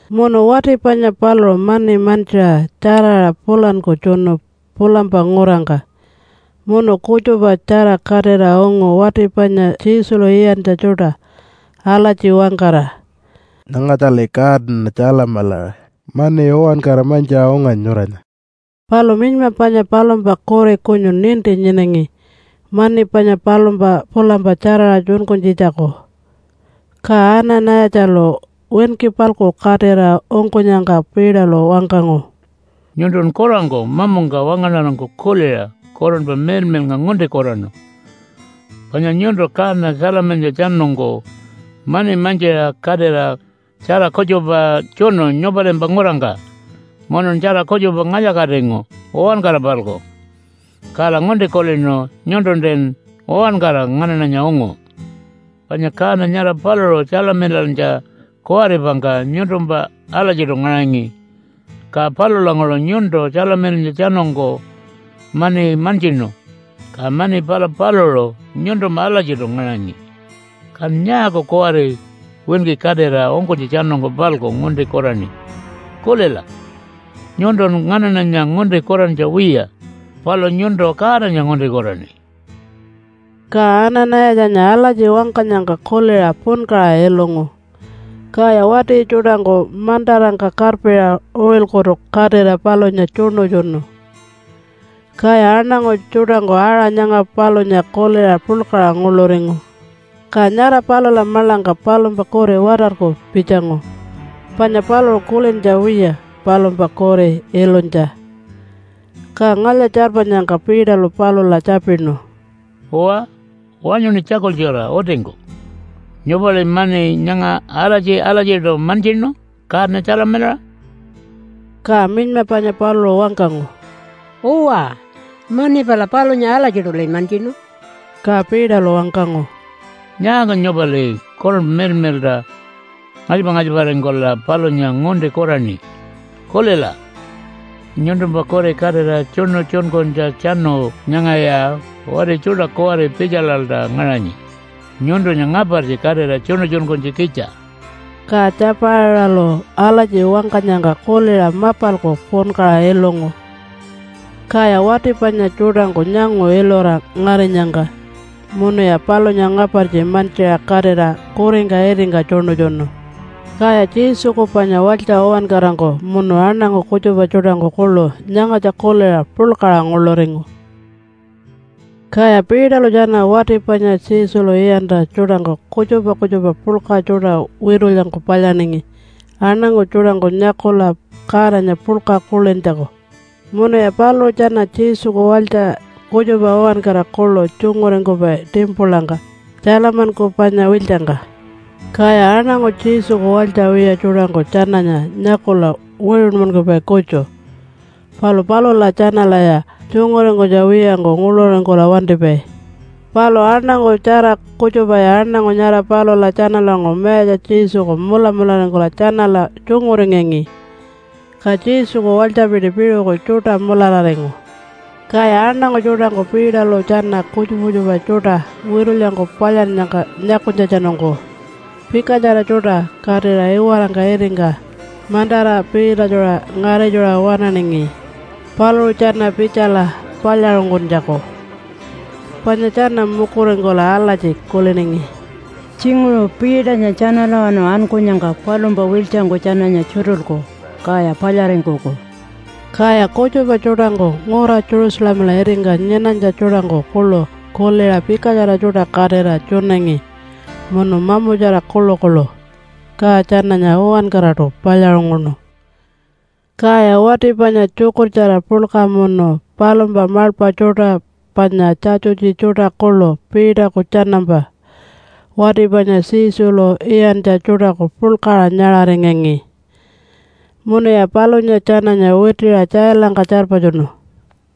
Munu wati panya paluṟu mani mantjiṟa tjaraṟa pulanku tjunu pulampa ngurangka munu kutjupatjara katira ungu wati panya Jesulu iyantja tjuṯa alatji wangkara, “Nyangatjali kaana tjalamilaṟa mani uwankara mantjiṟa unganyi nyuranya.” Palu minyma panya palumpa kuri kutju ninti nyinangi mani panya palumpa pulampa tjaraṟa tjunkunytjitjaku. Ka Ana-nayatjalu winki-palku katira ungkunyangka Peterlu wangkangu, “Nyuntun kurangku mamungka wangaṉarangku kuliṟa Kurunpa Miḻmiḻnga ngunti kuraṉu. Panya nyuntu kaana tjalamilantjatjanungku mani mantjiṟa katira tjara kutjupa tjunu nyupalimpa ngurangka munun tjara kutjupa ngalya-katingu uwankara-palku, kala ngunti kulinu nyuntuntin uwankara nganaṉanya ungu. Panya kaana nyara paluṟu tjalamilantja kuwaripangka nyuntumpa alatjiṯu ngaṟangi. Ka palulanguṟu nyuntu tjalamilantjatjanungku mani mantjinu, ka mani pala paluṟu nyuntumpa alatjiṯu ngaṟangi. Kan nyaaku kuwari winki katira ungkunytjatjanungku-palku ngunti kuraṉi? Kulila! Nyuntun nganaṉanya ngunti kurantja wiya, palu nyuntu Godanya ngunti kuraṉi.” Ka Ana-nayatjanya alatji wangkanyangka kuliṟa punkaṟa ilungu, kaya wati tjuṯangku mantarangka karpiṟa uṟilkutu katira palunya tjuṉutjunu. Kaya aṉangu tjuṯangku aṟa nyanga palunya kuliṟa puḻkaṟa nguḻuringu. Ka nyara palula maḻangka palumpa kuri watarku pitjangu, panya paluṟu kulintja wiya palumpa kuri ilunytja. Ka ngalya-tjarpanyangka Peterlu palula tjapinu, “Uwa, wanyuṉi tjakultjura utingku. Nyupali mani nyanga alatji-alatjiṯu mantjinu kaana tjalamilaṟa?” Ka minyma panya paluṟu wangkangu, “Uwa, mani pala palunya alatjiṯuli mantjinu.” Ka Peterlu wangkangu, “Nyaaku nyupali Kurunpa Miḻmiḻṯa ngalypa-ngalyparingkula palunya ngunti kuraṉi? Kulila! Nyuntumpa kuri katira tjuṉutjunkunytjatjanu nyangaya wati tjuṯa kuwari pitjalalta ngaṟanyi nyuntunya ngapartji katira tjuṉutjunkunytjikitja.” Ka Tjapaiṟalu alatji wangkanyangka kuliṟa mapalku punkaṟa ilungu, kaya wati panya tjuṯangku nyangu ilura ngarinyangka munuya palunya ngapartji mantjiṟa katira kuringka itingka tjuṉutjunu. Kaya Jesuku panya walytja uwankarangku munu aṉangu kutjupa tjuṯangku kuḻu nyangatja kuliṟa puḻkaṟa nguḻuringu. Kaya Peterlu tjana wati panya Jesulu iyantja tjuṯangku kutjupa kutjupa puḻka tjuṯa witulyangku palyaningi aṉangu tjuṯangku nyakula Godanya puḻka kulintjaku. Munuya paluṟu tjana Jesuku walytja kutjupa uwankara kuḻu tjunguringkupai timpulangka, Tjalamanku panya wiltjangka. Kaya aṉangu Jesuku walytja wiya tjuṯangku tjananya nyakula wiṟunmankupai kutju, palu palula tjanalaya tjunguringkunytja wiyangku nguḻuringkula wantipai. Palu aṉangu tjara kutjupaya aṉangu nyara palula tjanalanguṟu Mayatja Jesuku mulamularingkula tjanala tjunguringangi, ka Jesuku walytjapiti piṟuku tjuṯa mulararingu. Kaya aṉangu tjuṯangku Peterlu tjana kutjupa kutjupa tjuṯa witulyangku palyannyangka nyakunytjatjanungku pikatjara tjuṯa katira iwarangka itingka mantara piitatjuṟa ngaritjuṟa waṉaningi paluṟu tjana pitjala palyaṟunguntjaku. Panya tjana mukuringkula alatji kuliningi, “Tjinguṟu Peternya tjanalawanu ankunyangka palumpa wiltjangku tjananya tjutulku kaya palyaringkuku.” Kaya kutjupa tjuṯangku ngura Jerusalemala itingka nyinanytja tjuṯangku kuḻu kuliṟa pikatjara tjuṯa katira tjunangi munu mamutjara kuḻukuḻu, ka tjananya uwankaraṯu palyaṟunguṉu. Kaya wati panya tjukurtjara puḻka munu palumpa maḻpa tjuṯa panya Tjatjutji tjuṯa kuḻu Peterku tjanampa wati panya Jesulu iyantja tjuṯaku puḻkaṟa nyaṟaringangi. Munuya palunya tjananya witiṟa tjailangka tjarpatjunu.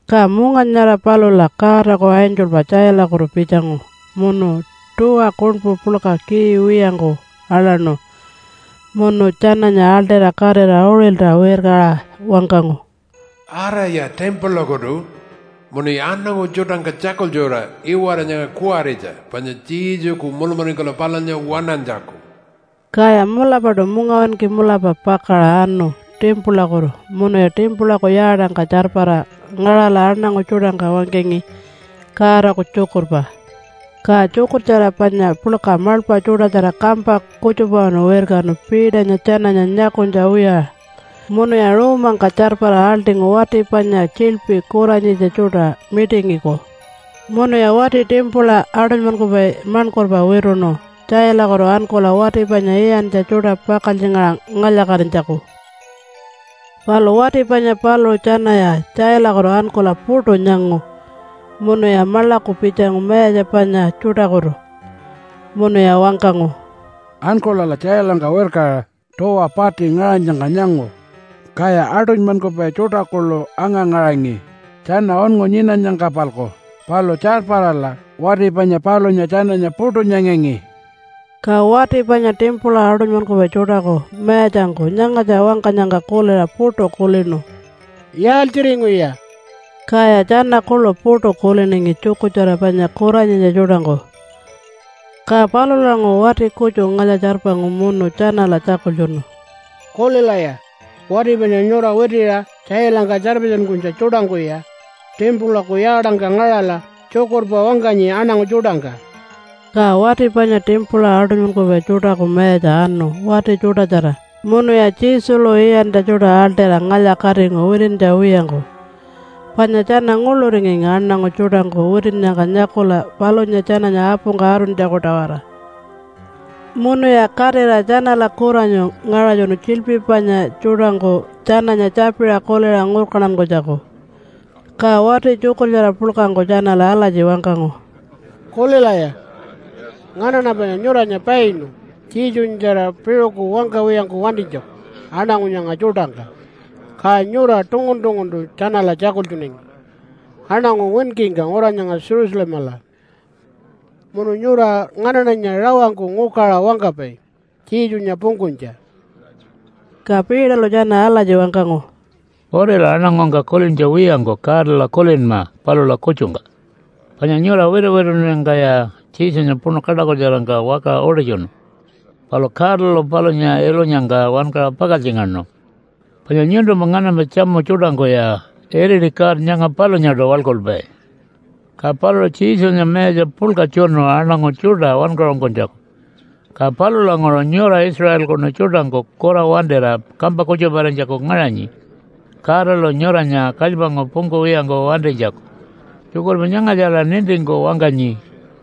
Ka munga nyara palula Godaku angelpa tjailakutu pitjangu munu tuwa kuṉpu puḻka key wiyangku aḻaṉu munu tjananya aḻṯira katira uṟilta wirkaṟa wangkangu, “Araya timpulakutu munuya aṉangu tjuṯangka tjakultjura iwara nyanga kuwaritja panya Jesuku mulamularingkula palunya waṉantjaku.” Kaya mulapaṯu mungawinki mulapa pakaṟa anu timpulakutu munuya timpulaku yaatangka tjarpara ngaṟala aṉangu tjuṯangka wangkangi Godaku tjukurpa. Ka tjukurtjara panya puḻka maḻpa tjuṯatjara kampa kutjupawanu wirkanu Peternya tjananya nyakunytja wiya, munuya ruumangka tjarpara aḻṯingu wati panya tjiḻpi kuranyitja tjuṯa mitingiku. Munuya wati timpula aṯunymankupai maṉkurpa wituṉu tjailakutu ankula wati panya iyantja tjuṯa pakaltjingaṟa ngalya-katinytjaku. Palu wati panya paluṟu tjanaya tjailakutu ankula puṯu nyangu munuya maḻaku pitjangu mayatja panya tjuṯakutu. Munuya wangkangu, “Ankulala tjailangka wirkaṟa tuwa pati ngaṟanyangka nyangu, kaya aṯunymankupai tjuṯa kuḻu anga-ngaṟangi tjana unngu nyinanyangka-palku. Palu tjarparala wati panya palunya tjananya puṯu nyangangi.” Ka wati panya timpula aṯunymankupai tjuṯaku mayatjangku nyangatja wangkanyangka kuliṟa puṯu kulinu, “Yaaltjiringuya?” Kaya tjana kuḻu puṯu kuliningi tjukurtjara panya kuranyitja tjuṯangku. Ka palulanguṟu wati kutju ngalya-tjarpangu munu tjanala tjakultjunu, “Kulilaya! Wati panya nyura witiṟa tjailangka tjarpatjunkunytja tjuṯangkuya timpulaku yaatangka ngaṟala tjukurpa wangkanyi aṉangu tjuṯangka.” Ka wati panya timpula aṯunymankupai tjuṯaku mayatja anu wati tjuṯatjara munuya Jesulu iyantja tjuṯa aḻṯira ngalya-katingu witintja wiyangku, panya tjana nguḻuringangi aṉangu tjuṯangku witinnyangka nyakula palunya tjananya apungka atuntjaku-tawara. Munuya katira tjanala kuranyu ngaṟatjunu tjiḻpi panya tjuṯangku tjananya tjapiṟa kuliṟa ngurkantankunytjaku. Ka wati tjukurtjara puḻkangku tjanala alatji wangkangu, “Kulilaya! Nganaṉa panya nyuranya painu Jesunyatjara piṟuku wangkawiyangku wantinytjaku aṉangu nyanga tjuṯangka, ka nyura tungun-tunguntu tjanala tjakultjunangi aṉangu winkingka ngura nyanga Jerusalemala. Munu nyura nganaṉanya rawangku ngukaṟa wangkapai Jesunya pungkunytja.” Ka Peterlu tjana alatji wangkangu, “Utila aṉangungka kulintja wiyangku Godala kulinma palula kutjungka. Panya nyura wituwitunnyangkaya Jesunya puṉu kaṯakutjarangka wakaṟa utitjunu. Palu Godalu palunya ilunyangka wankaṟa pakaltjingaṉu. Panya nyuntumpa nganampa tjamu tjuṯangkuya iriti God nyanga palunyaṯu waḻkulpai. Ka paluṟu Jesunya mayatja puḻka tjunu aṉangu tjuṯa wankaṟunkunytjaku. Ka palulanguṟu nyura Israelkunu tjuṯangku kura wantira kampa kutjuparinytjaku ngaṟanyi Godalu nyuranya kalypangku pungkuwiyangku wantinytjaku. Tjukurpa nyangatjala nintingku wangkanyi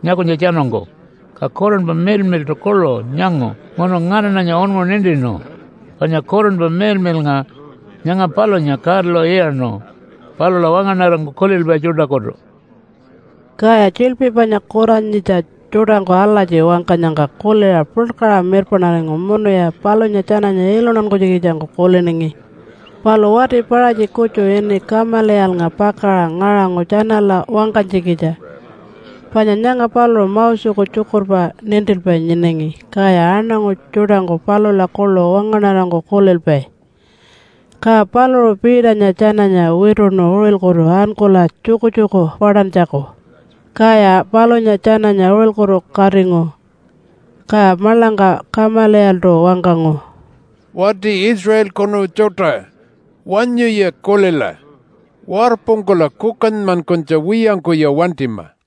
nyakunytjatjanungku, ka Kurunpa Miḻmiḻṯu kuḻu nyangu munu nganaṉanya unngu nintinu. Panya Kurunpa Miḻmiḻnga nyanga palunya Godalu iyaṉu palula wangaṉarangku kulilpai tjuṯakutu.” Kaya tjiḻpi panya kuranyitja tjuṯangku alatji wangkanyangka kuliṟa puḻkaṟa mirpaṉaringu munuya palunya tjananya iluntankunytjikitjangku kuliningi. Palu wati Paṟatji kutju ini Kamaliyalnga pakaṟa ngaṟangu tjanala wangkanytjikitja, panya nyanga paluṟu Moseku tjukurpa nintilpai nyinangi kaya aṉangu tjuṯangku palula kuḻu wangaṉarangku kulilpai. Ka paluṟu Peternya tjananya wituṉu uṟilkutu ankula tjukutjuku paṯantjaku, kaya palunya tjananya uṟilkutu katingu. Ka maḻangka Kamaliyaltu wangkangu, “Wati Israelkunu tjuṯa! Wanyuya kulila! Warpungkula kukanymankunytja wiyangkuya wantima!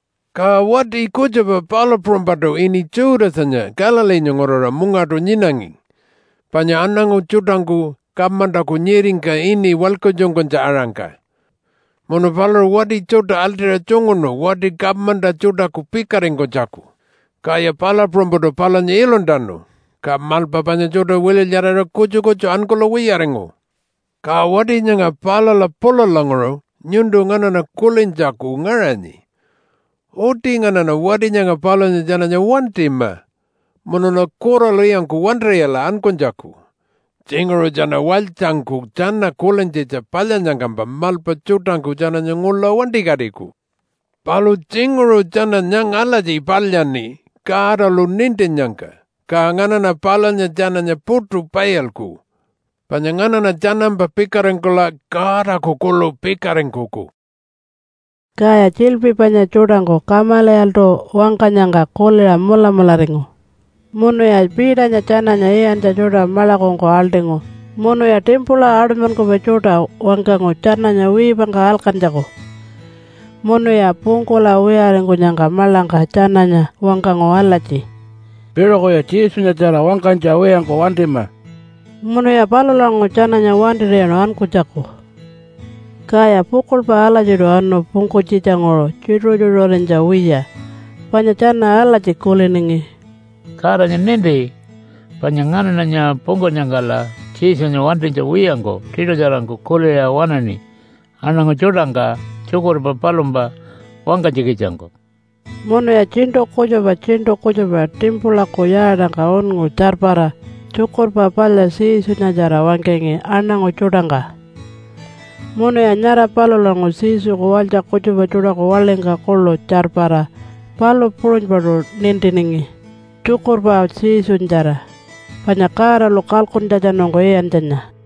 Ka wati kutjupa palu puṟunypaṯu ini Judasanya Galileenya nguraṟa mungaṯu nyinangi, panya aṉangu tjuṯangku kamantaku nyiringka ini walkatjunkunytja-aṟangka. Munu paluṟu wati tjuṯa aḻṯira tjunguṉu wati kamanta tjuṯaku pikaringkunytjaku. Kaya palu puṟunypaṯu palunya iluntanu, ka maḻpa panya tjuṯa wililyaraṟa kutju kutju ankula wiyaringu. Ka wati nyanga palula pulalanguṟu nyuntu nganaṉa kulintjaku ngaṟanyi. Uti nganaṉa wati nyanga palunya tjananya wantima munula kuralwiyangku wantir'iyala ankunytjaku. Tjinguṟu tjana walytjangku tjana kulintjitja palyannyangkampa maḻpa tjuṯangku tjananya ngula wantikatiku. Palu tjinguṟu tjana nyanga alatji palyaṉi Godalu nintinnyangka, ka nganaṉa palunya tjananya puṯu pailku, panya nganaṉa tjanampa pikaringkula Godaku kuḻu pikaringkuku.” Kaya tjiḻpi panya tjuṯangku Kamaliyaltu wangkanyangka kuliṟa mulamularingu. Munuya Peternya tjananya iyantja tjuṯa maḻakungku aḻṯingu munuya timpula aṯunymankupai tjuṯa wangkangu tjananya wiipangka alkantjaku. Munuya pungkula wiyaringkunyangka maḻangka tjananya wangkangu alatji, “Piṟukuya Jesunyatjara wangkanytja wiyangku wantima.” Munuya palulanguṟu tjananya wantir'iyaṉu ankunytjaku. Kaya pukuḻpa alatjiṯu anu pungkunytjitjanguṟu tjituṟu-tjituṟurinytja wiya, panya tjana alatji kuliningi, “Godanya ninti panya nganaṉanya pungkunyangkala Jesunya wantinytja wiyangku tiṯutjarangku kuliṟa waṉaṉi aṉangu tjuṯangka tjukurpa palumpa wangkanytjikitjangku.” Munuya tjiṉṯu kutjupa tjiṉṯu kutjupa timpulaku yaatangka unngu tjarpara Tjukurpa Palya Jesunyatjara wangkangi aṉangu tjuṯangka, munuya nyara palulanguṟu Jesuku walytja kutjupa tjuṯaku waḻingka kuḻu tjarpara palu puṟunypaṯu nintiningi tjukurpa Jesunyatjara panya Godalu kalkuntjatjanungku iyantjanya.